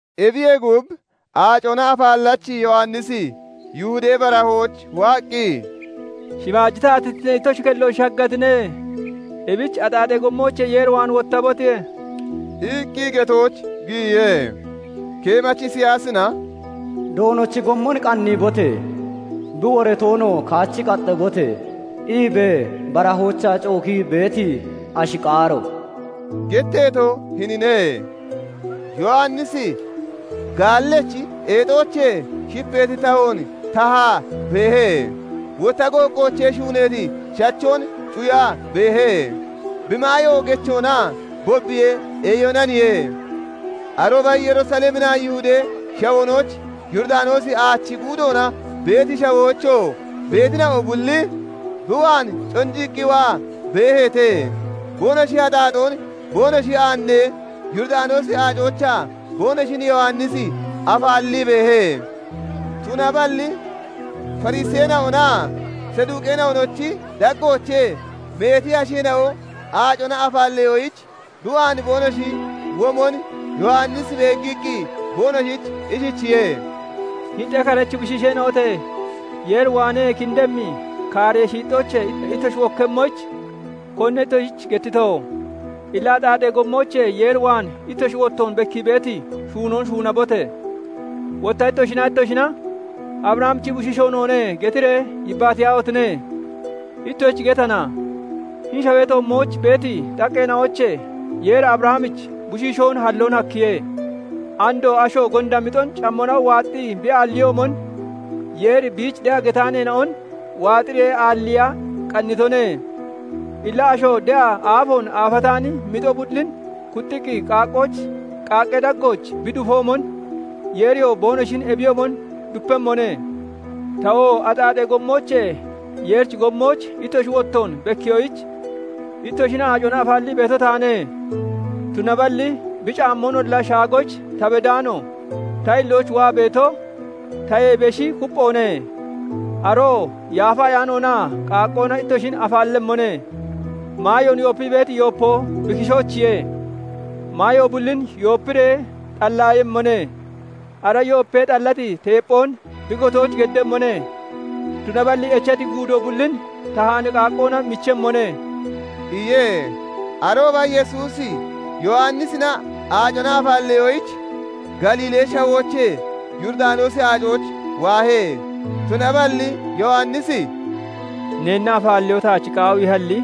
Ebiyee gub, Aacona Afaallachi Yowannisi Yihudee Barahooch waaqqi, "Shimaaji taatittinee ittoshi kellooch shaggatine; ebich axaaxee gommoochee Yeer waan wottabote!" iqqi getooch giyiye. Keemachi Isiyaasina " 'Doonochi gommon qanniibote! Bi woratoonoo kaachi qaxabote!' iibee barahoochaa cookii beeti ashi qaaro" getteeto hinine. Yowannisi gaallechi eexoochee shipeeti tahoon tahaa beehe; wotta gooqqoochee shuuneeti shachoon cuyaa beehe; bi maayoo gechoonaa bobbiyee eeyonaniye. Arooba Yerusaleminaa Yihudee Shawoonooch, Yooridanoosi Aachi guudoona beeti shawoochoo beetina'o bulli bi waan conjiqqi waa beeheete; Boonoshi axaaxoon boonoshi aannee, Yooridanoosi Aacoochaa boonoshin Yowannisi afaallii beehe. Tunaballi Fariseena'onaa Saduqeena'onochi daggoochee meeti asheena'o aacona afaalleyoyich bi waan boonoshi womon Yowannisi beeggiqqi, boonoshich ishichiye:- "Hini xekarechi bushiisheena'ote! Yeer waanee kindemmi kaaree shiixxoochee ittoshi wokkemmoyich, konine ittoshich gettito? Illa axaaxee gommoochee Yeer waan ittoshi wottoon bekkii beeti shuunoon shuunabote! Wotta ittoshinaa ittoshina 'Abrahamichi bushiishoo noone' getiree yebaniyaahotine! Ittoshich getana; hini shawee toommooch beeti xaqqeena'oochee Yeeri Abrahamich bushiishoon halloon hakkiye. Andoo asho gonda mixon cammona waaxxii bi aalliyoomon, Yeeri biich de'a getaaneena'on waaxiree aalliiya qannitone. Illa asho de'a aafoon aafataani mixo bullin kuxxiqqi qaaqqee daggooch bi dufoomon, Yeeriyoo boonoshin ebiyoomon dupemmone. "Tawoo axaaxee gommoochee Yeerichi gommooch ittoshi wottoon bekkiyoyich, ittoshin aacona afaallii beeto taane; tunaballi bi caammoonolla shaagoyich ta beddaano ta hillooch waa beeto, tayee beshi kupphoone; aroo Yaafa Ayaanoonaa qaaqqoona ittoshin afaallemmone. Maayoon yoopii beeti yoopo bi kishoochiye; maayo bullin yoopiree xalliiyemmone; ara yoopee xallati teepphoon bi gotooch giddemmone; tunaballi echati guudo bullin tahaani qaaqqoona michemmone" iye. Arooba Yesuusi Yowannisina aacona afaalleyoyich, Galiilee Shawoochee Yooridanoosi Aacooch waahe. Tunaballi Yowannisi "Neenna afaalleyoo taach qaawiihalli,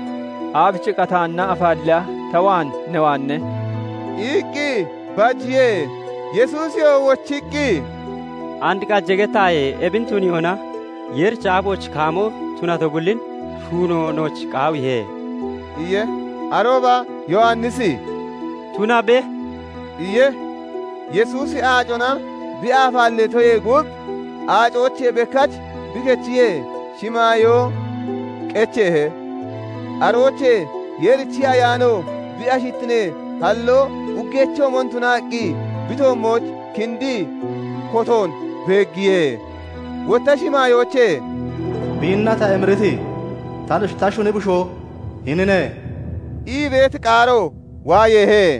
aabichiqqa taanna afaalleeya ta waan ne waane?" iqqi bajiye. Yesuusiyoo wochiqqi, "And qaje gettaaye! Ebin tuniyoona Yeerichi aafooch kaamo tunato bullin shuuno nooch qaawiihe" iye. Arooba Yowannisi "Tunabe" iye. Yesuusi aacona bi afaalleetoyee gub, aacoochee bekkach bi kechiyee, shimaayoo [biichoo] qecheehe; aroochee Yeerichi Ayaano bi ashittinee hallo uggeechoomon tunaqqi, bi toommooch kindii kotoon beeggiye. Wotta shimaayoochee "Biinna ta emiriti, ta shuni bushoo hinine" ii beeti qaaro waayeehe.